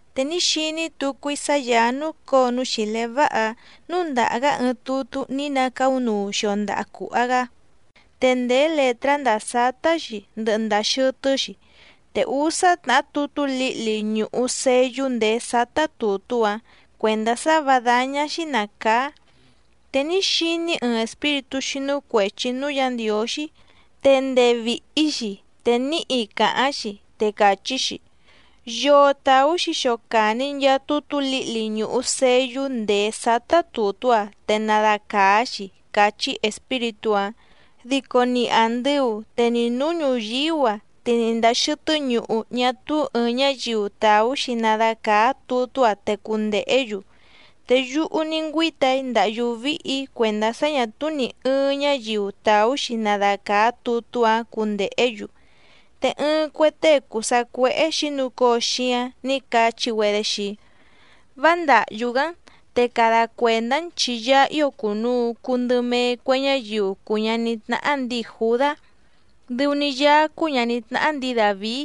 Te ní xiní tucu‑í sá Yàá núcǒo núú xìlé váha‑áⁿ núndàha‑gá ɨɨⁿ tutú ní nacaúnuu xio ndaha cùha‑gá, te ndèé lètrá ndàa sátá‑xi ndɨhɨ ndàa xɨtɨ́‑xi, te úsá tnàhá tutú lǐhli ñùhu seyú ndèé sátá tùtú‑áⁿ cuèndá sá vǎ dáñá‑xí nàcaá. Te ní xiní‑í ɨɨⁿ espíritú xínú cuèchi núú Yǎ Ndiǒxí, te ndee vìhi‑xi te níhi càháⁿ‑xi, te càchí‑xi: —¿Yoo tàú‑xi xocàni nchaa tutú lǐhli ñùhu seyú ndèé sátá tùtú‑a te nadacàá‑xi? —càchí espíritú‑áⁿ. Dico ni àndɨu, te ni nǔú ñùyíú‑a, te ni ndàa xɨtɨ́ ñuhu ñá túú ɨ̀ɨⁿ ñáyiu tàú‑xi nadacàá tutú‑áⁿ te cundèhé‑yu. Te yúhú ní ngüíta‑í ndàhyú víhì‑í cuèndá sá ñà túú nì ɨɨⁿ ñáyiu tàú‑xi nadacàá tutú‑áⁿ cundèhé‑yu. Te ɨɨⁿ cue tée cùu sacuéhé xǐnucóo xíáⁿ nǐ cachí‑güedé xii‑í: —Vá ndàhyú‑gá‑n, te cada cuèndá‑n chi Yaá ío cùnuu cuu ndɨ mee cue ñáyiu cùu ñaní tnáhá ndǐi Jùdá, dɨu‑ni Yaá cúú ñàní tnáhá ndǐi Dàvií,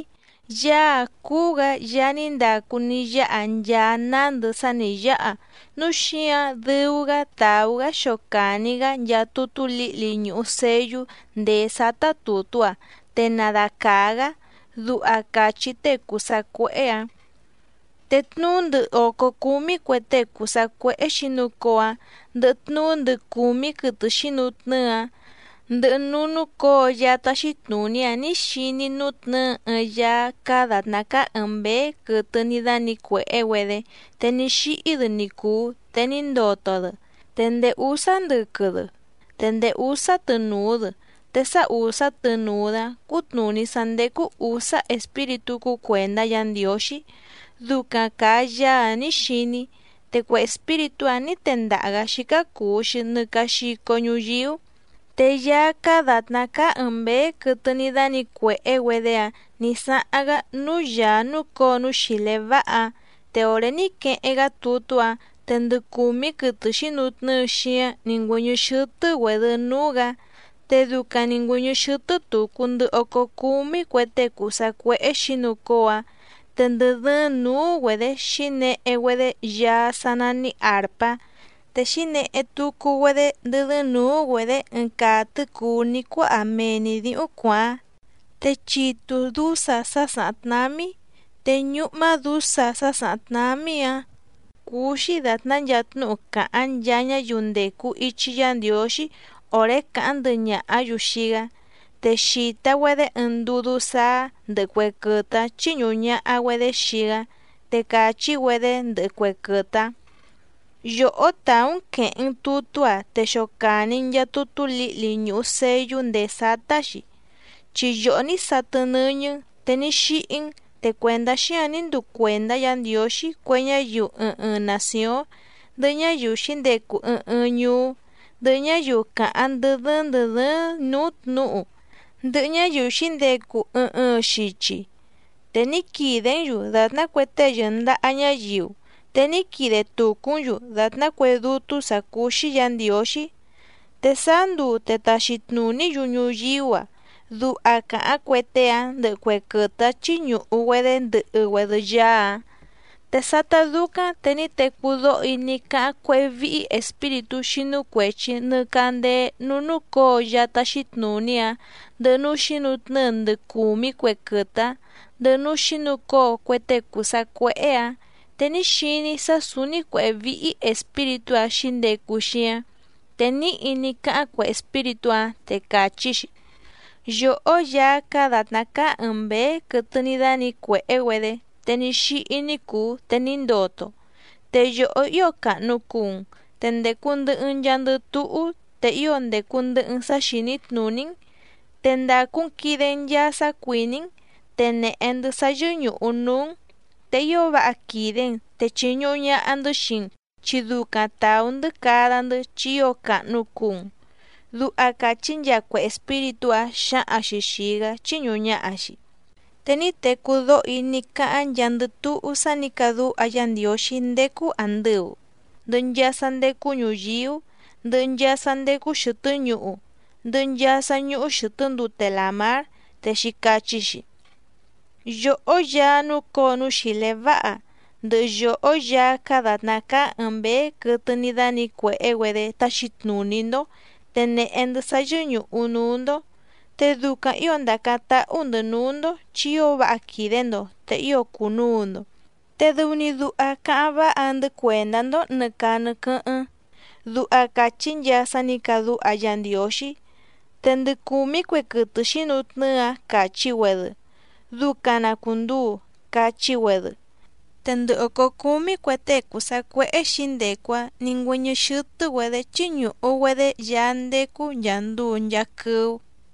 Yaá‑áⁿ cúú‑gǎ Yaá ní ndacu ní yáha nchaa nándɨ sá nǐ yáha, núu xíǎⁿ dɨu‑gá tàú‑gá xocàni‑gá nchaa tutú lǐhli ñùhu seyú ndèé sátá tùtú‑áⁿ te nadacàá‑gá —duha càchí tée cùu sacuéhé‑ǎⁿ. Te tnuú ndɨ òcó cúmí cue tée cùu sacuéhé xǐnucóo‑áⁿ, ndɨhɨ tnuú ndɨ cùmí quɨtɨ xǐnutnɨ́ɨ‑áⁿ, ndɨhɨ núú núcǒo Yaá táxí tnùní‑áⁿ nǐ xiní‑í nútnɨ̌ɨ ɨɨⁿ Yaá cáá dàtná cáá ɨ̀ɨⁿ mbéé quɨtɨ ní dánǐcuèhé‑güedé te ní xíhí‑dɨ ni cùu te ní ndoto‑dɨ, te ndèé úsá ndɨquɨ‑dɨ, te ndèé úsá tɨnùu‑dɨ, te sá ùsá tɨnùu‑dɨ‑áⁿ cútnùní sá ndécú ǔsá espíritú cúú cuèndá Yǎ Ndiǒxí, ducaⁿ càa Yaá‑áⁿ nǐ xiní‑í. Te cue espíritú‑áⁿ nǐ tendaha‑gǎ xícá cùu‑xi nɨ caa xico ñuyíú. Te Yaá cáá dàtná cáá ɨ̀ɨⁿ mbéé quɨtɨ ní dánǐcuèhé‑güedé‑áⁿ nǐ sáháⁿ‑gá núú Yàá núcǒo núú xìlé váha‑áⁿ. Te òré ní queheⁿ‑gá tutú‑áⁿ te ndɨ cùmí quɨtɨ xǐnutnɨ́ɨ xíáⁿ nǐ ngüɨ́ñɨ́ xɨ́tɨ́‑güèdɨ núú‑gǎ, te ducaⁿ nǐ ngüɨ́ñɨ́ xɨ́tɨ́ tùcu ndɨ ócó cúmí cue tée cùu sacuéhé xǐnucóo‑áⁿ, te ndɨ dɨ́ɨ́ⁿ nǔú‑güedě xǐnehe‑güedé yaá sá nání àrpá, te xǐnehe tucu‑güedé ndɨ́ dɨ́ɨ́ⁿ nǔú‑güedě ɨɨⁿ caa tɨ̌cùú ní cuáha mee‑ni dǐhúⁿ cuàáⁿ, te chitu dǔsa sá sàháⁿ tnámí. Te ñúhmá dǔsa sá sàháⁿ tnámí‑ǎⁿ cúú‑xí dàtná nchaa tnúhu càháⁿ nchaa ñáyiu ndècu ichi Yá Ndiǒxí òré càháⁿ ndɨhɨ ñàhá‑yu xii‑gá. Te xìta‑güedé ɨɨⁿ ndudú sáá ndɨ̀hɨ cue quɨtɨ‑áⁿ chíñùhu ñaha‑güedé xii‑gá, te càchí‑güedé ndɨhɨ cue quɨtɨ‑áⁿ: Yòhó tàú‑n quèheⁿ‑n tutú‑a te xocàni‑n nchaa tutú lǐhli ñùhu seyú ndèé sátá‑xi, chi yòhó ní satɨ nɨ́ñɨ́‑n te ní xíhí‑n, te cuèndá xíǎⁿ ní nduu cuèndá Yǎ Ndiǒxí cue ñáyiu ɨɨⁿ ɨɨⁿ nàcióⁿ, ndɨhɨ ñáyiu xǐndecu ɨɨⁿ ɨɨⁿ ñuú, ndɨhɨ ñáyiu càháⁿ ndɨ́ dɨ́ɨ́ⁿ ndɨ̀ dɨ́ɨ́ⁿ nǔú tnǔhu, ndɨhɨ ñáyiu xǐndecu ɨɨⁿ ɨɨⁿ xichi. Te ní quìdé‑n‑yu dàtná cue tée yɨ̀ndaha ñáyiu, te ní quide tùcú‑n‑yu dàtná cue dútú sǎ cúú‑xí Yǎ Ndiǒxí. Te sáá nduu te taxi tnùní‑yu ñuyíú‑a. Duha càháⁿ cue tée‑áⁿ ndɨhɨ cue quɨtɨ‑áⁿ chíñùhu‑güedé ndɨhɨ‑güedɨ Yaá‑áⁿ. Te sátá dúcáⁿ te ní tecú dóho‑í ní cáháⁿ cuéhé víhí espíritú xínú cuèchi nɨ candéé núú núcǒo Yaá táxí tnùní‑áⁿ, ndɨhɨ núú xǐnutnɨ́ɨ ndɨ cùmí cue quɨtɨ‑áⁿ, ndɨhɨ núú xǐnucóo cue tée cùu sacuéhé‑ǎⁿ, te ní xiní‑í sá sǔúní cuěhé víhí espíritú‑áⁿ xǐndecu xíáⁿ, te níhi ní cáháⁿ cue espíritú‑áⁿ, te càchí‑xi: Yòhó Yaá cáá dàtná cáá ɨ̀ɨⁿ mbéé quɨtɨ ní dánǐcuèhé‑güedé te ní xíhí ní cùu te ní ndoto, te yòhó ío càhnu cuu‑n, te ndècu ndɨhɨ‑n nchaandɨ túhú, te ío ndècu ndɨhɨ‑n sá xìní tnùní‑n, te ndàcu‑n quide‑n nchaa sá cuìní‑n, te nèhe‑ndɨ́ sá yɨ́ñùhu núú‑n, te ío váha quìde‑n, te chìñuhu ñaha‑ndɨ́ xii‑n, chi ducaⁿ tàú‑ndɨ́ cada‑ndɨ́ chi ío càhnu cuu‑n. Duha càchí nchaa cue espíritú‑áⁿ xǎhaⁿ‑xi xìi‑gá chíñùhu ñaha‑xi. Te ní tecú dóho‑í ní cáháⁿ nchaandɨ túhú sá nǐ cadúha Yá Ndiǒxí ndécú àndɨu, ndɨhɨ nchaa sá ndécú ñùyíú, ndɨhɨ nchaa sá ndécú xɨ̀tɨ́ ñuhu, ndɨhɨ nchaa sá ñúhú xɨ̀tɨ́ ndute làmár, te xǐcachí‑xi: Yòhó Yaá núcǒo núú xìlé váha, ndɨhɨ yòhó Yaá cáá dàtná cáá ɨ̀ɨⁿ mbéé quɨtɨ ní dánǐcuèhé‑güedé táxí tnùní‑ndó, te nèhe‑ndɨ́ sá yɨ́ñùhu núú‑ndó, te ducaⁿ ǐo ndàcáⁿ táhú‑ndɨ̌ núú‑ndó, chi ío váha quìde‑ndo te ío cùnuu‑ndo, te dɨu‑ni duha cáháⁿ váha‑ndɨ́ cuèndá‑ndó nɨ̀ caa nɨ quɨ́hɨ́ⁿ. Duha càchí nchaa sá nǐ cadúha Yá Ndiǒxí. Te ndɨ cùmí cue quɨtɨ xǐnutnɨ́ɨ‑áⁿ càchí‑güedɨ: —¡Ducaⁿ na cùnduu! —cachí‑güedɨ. Te ndɨ òcó cúmí cue tée cùu sacuéhé xǐndecu‑áⁿ nǐ ngüɨ́ñɨ́ xɨ́tɨ́‑güedě chíñùhu‑güedé Yaá ndécú nchàa nduu nchaa quɨ́ú.